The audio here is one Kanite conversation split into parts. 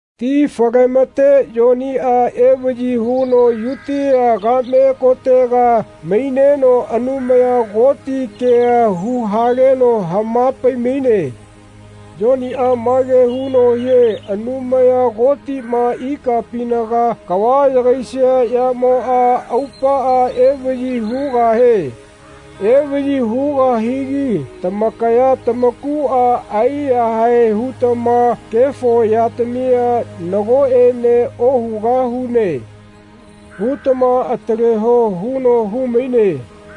Ti fale-mate Yoniꞌa evaꞌyi huno Yutia kaꞌme kotega maineno Anumaya Koti kea hu-haleno hama-pai-maine. Yoniꞌa mage huno hie Anumaya Kotiꞌma ikapinaga kava yagaisia yamoꞌa aupaꞌa evaꞌyi hugahie. Evaꞌyi hugahigi tamakaya tamakuꞌa aiyahae hutama kefo yatamia “Nagoꞌene ohugahune.” hutama ataleho huno hu-maine.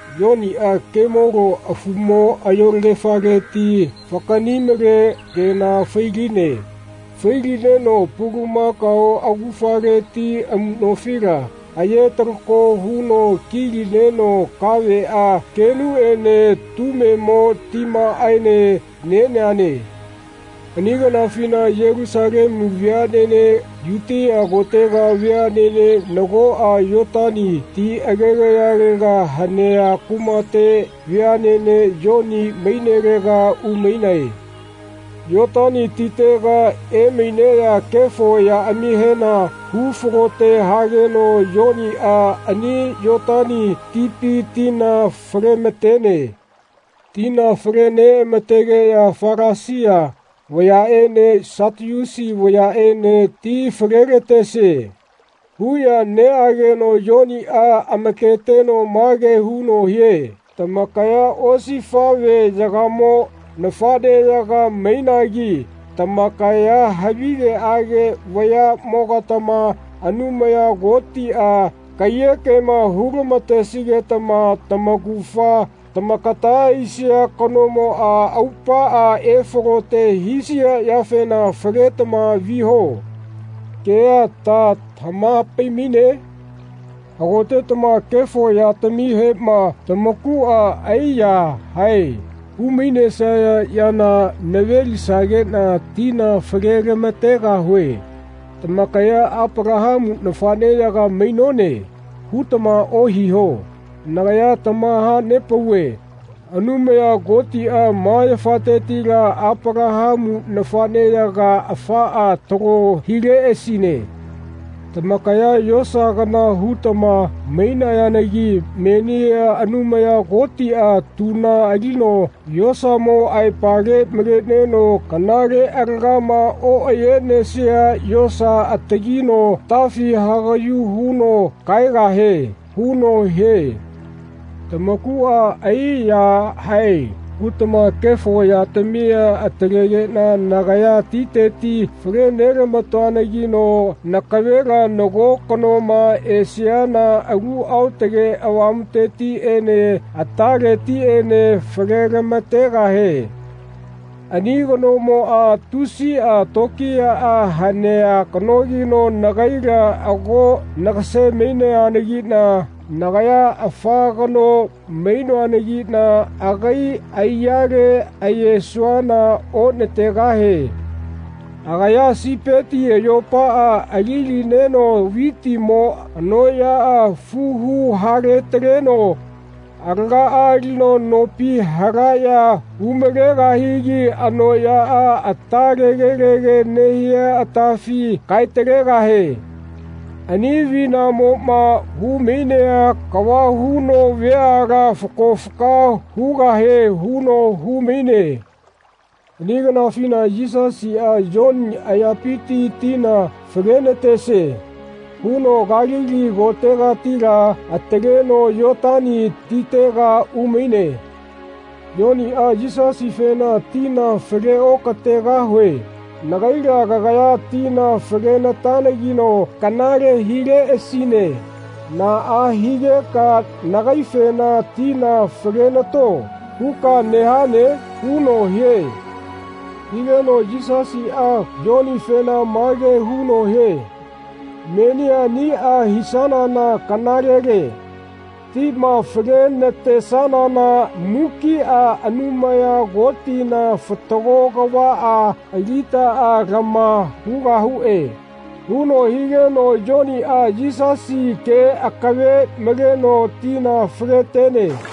Yoniꞌa kemolo afumo ayolagefaleti fakaꞌni-male kena fai-line. Fai-lineno pulamakao augafaleti amuꞌnofila aye-talako huno ki-lineno kaveꞌa keꞌnuꞌene tumemo timaꞌaene neneane. Ani kanafina Yelusalemu veaꞌnene Yutia kotega veaꞌnene nagoꞌa Yotani ti agegayalega hanea kumate veaꞌnene Yoni mainelega umainae. Yotani titega emaineꞌya kefo yaꞌamihena hu-falote hageno Yoniꞌa ani Yotani tipi tina fale-ma-tene. Tina fale-neꞌama-tegeꞌya Falasia vayaꞌene Satiusi vayaꞌene “Ti fale-la-tesie.” huꞌya neꞌageno Yoniꞌa amaketeno mage huno hie “Tamakaya osifaꞌveyagamo nafaꞌneyaga mainagi tamakaya havigeꞌage vayaꞌmogatama Anumaya Kotiꞌa kaiyekema hu-lama-tesigetama tamaugafa tamakata aisia kanamoꞌa aupaꞌa efalote hisia yafena ‘Faletama viho.’ kea ta tamaha-pai-maine? Hagotetama kefo yatamihema tamakuꞌa ai-yahae hu-mainesaya yana nave-lisageꞌna tina fale-lama-tegahue. Tamakaya ‘Apalahamu nafaꞌneyaga mainone.’ hutama ohiho. Nagaya tamaha-nepauve Anumaya Kotiꞌa ma yafatetila Apalahamu nafaꞌneyaga afaꞌa talo hileꞌasine. Tamakaya yosa kana hutama mainayanagi menia Anumaya Kotiꞌa tuna alino yosamo aipale maleneno kanale alagama oꞌayenesia yosa atagino atafi hagaꞌyu huno kaegahie.” huno hie. Tamakuꞌa ai-yahae hutama kefo yatamia atalegeꞌna nagaya titeti fale-nelama-toanagino nakavela nago kanoma esiana Alu Aotage Avamutetiꞌene ataletiꞌene fale-lama-tegahie. Ani kanomoꞌa tusiꞌa tokiyaꞌa hanea kanogino nagaila ago nagase-maineanagiꞌna nagaya afa kano mainoanagiꞌna agai aiyale ayesuana onategahie. Agaya sipeti ayopaꞌa ali-lineno vitimo anoꞌyaꞌa fuhu hale-taleno alagaꞌa alino nopi halaꞌya hu-malegahigi anoꞌyaꞌa ata tegelege nehia atafi kae-talegahie. Ani avinamoꞌma hu-mainea kava huno veala fako faka hugahie huno hu-maine. Ani kanafina Yisasiꞌa “Yoni ayapiti tina fale-natesie.” huno Kalili kotegatila ataleno Yotani titega umaine. Yoniꞌa Yisasifena “Tina fale-oka-tegahue. Nagaila kagaya tina fale-na-tanageno kanale hileꞌasine naꞌa higeka nagaifena ‘Tina fale-nato.’ huka nehane?” huno hie. Higeno Yisasiꞌa Yonifena mage huno hie “Menia aniꞌa hisanana kanalele. Tima fale-na-tesanana mukiꞌa Anumaya Kotina fatago kavaꞌa alitaꞌa lama hugahuꞌe.” huno higeno Yoniꞌa Yisasi ke akave maleno tina fale-tene.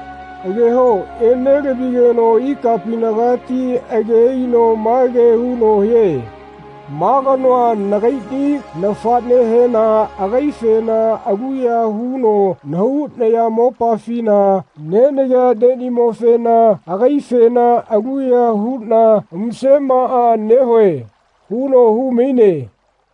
Ageho enelavigeno ikapinagati age aino mage huno hie “Ma kanoa nagaiꞌni nafaꞌnehena agaifena aluya huno nahau nayamopafina nenagea neꞌnimofena agaifena aluya huꞌna musemaꞌa nehue.” huno hu-maine.